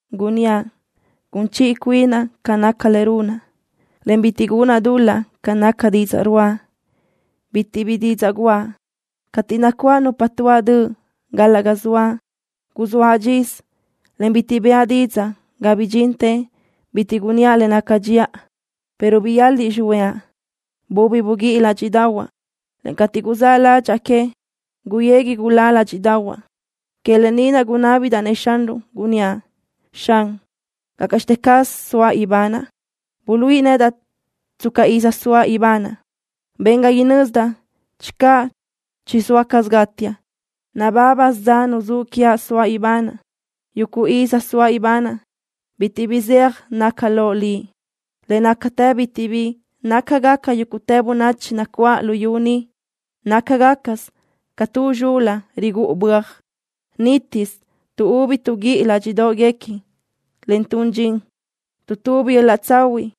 Gunníaʼ: Gun chiʼi cuinaʼ ca naca le runaʼ, en bitiʼ gunaʼ dul-laʼ ca naca didzaʼ ruáʼa. Bitiʼ bi didzaʼ guʼa cateʼ nacuáʼ nupa tuáʼ döʼ gal-laʼ ga zoaʼ. Guzóaʼ dxisö, en bitiʼ bëʼa didzaʼ ga bidxintë bitiʼ gunníaʼ le naca dxiʼa, pero biyaliʼ xihuëʼa. Bubi buguíʼi ládxiʼdaʼahuaʼ, en cateʼ guzáʼ ládxaʼa que, guyegui gulá ládxiʼdaʼahuaʼ. Que lë ni naʼ gunábidaʼ-nëʼ Xanruʼ, gunníaʼ: Xan, ¿gácaʼxte caz soaʼ ibanaʼ? Buluíʼi nedaʼ tsca iz soaʼ ibanaʼ. Ben ga inözdaʼ channö chizóa caz gátiaʼ. Nabábasö dza nuzúʼ quiaʼ soaʼ ibanaʼ. Yuguʼ iz soaʼ ibanaʼ bitiʼ bi zeaj naca loʼ Liʼ. Le nácatë bitiʼ bi nácagaca yúguʼtë bönachi nacuáʼ luyú ni. Nácagacasö ca tu zxul-la rigúʼu böaj. Nítisö tuʼúbi tuʼguíʼi ládxiʼdoʼguequi, en tun dxin. Tuʼtubi yöl-laʼ tsahuiʼ,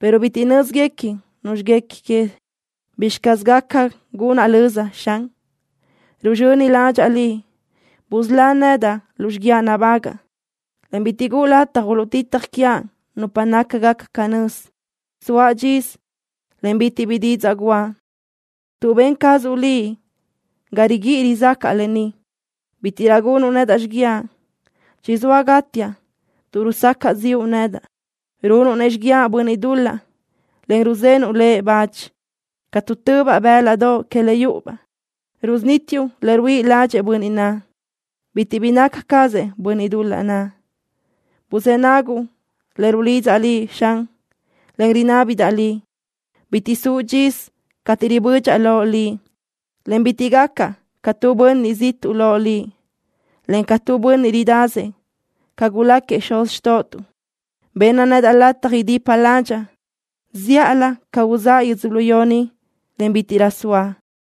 pero bitiʼ nö́zguequi nuzxi guequi que. ¿Bizxi caz gaca gunaʼ löza, Xan? Ruzxöni ládxaʼa Liʼ. Busölá nedaʼ lu xiguiaʼ nabágaʼa, en bitiʼ guʼu lataj uluʼtitaj quiaʼ nupa nácagaca canö́z. Soaʼ dxisö, en bitiʼ bi didzaʼ guʼa, tuʼ ben cazuʼ Liʼ ga riguíʼi rizácaʼa lë ni. Bítiʼrö gunuʼ nedaʼ xiguiaʼ. Chizóa gátiaʼ tuʼ rusacaʼ ziʼu nedaʼ. Runuʼ-nëʼ xiguiaʼ bönniʼ dul-laʼ, en ruzenuʼ lëʼ bach. Ca tuʼtöbaʼ bë́ladoʼ que le yúʼubaʼ, rusunítiuʼ le ruíʼi ládxëʼë bönniʼ naʼ. Bitiʼ bi naca cazëʼ bönniʼ dul-laʼ naʼ. Buzë́ naguʼ le rulidzaʼ Liʼ, Xan, en le rinábidaʼ Liʼ. Bitiʼ suʼ dxisö cateʼ ribödxaʼ loʼ Liʼ, en bitiʼ gacaʼ ca tu bönniʼ ziʼtuʼ loʼ Liʼ, en ca tu bönniʼ ridasëʼ ca guláquiëʼ xuz xtóʼotuʼ. Benna nedaʼ lataj idipa ládxaʼa zíʼalö ca uzáʼa yödzölió ni, en bítiʼrö soaʼ.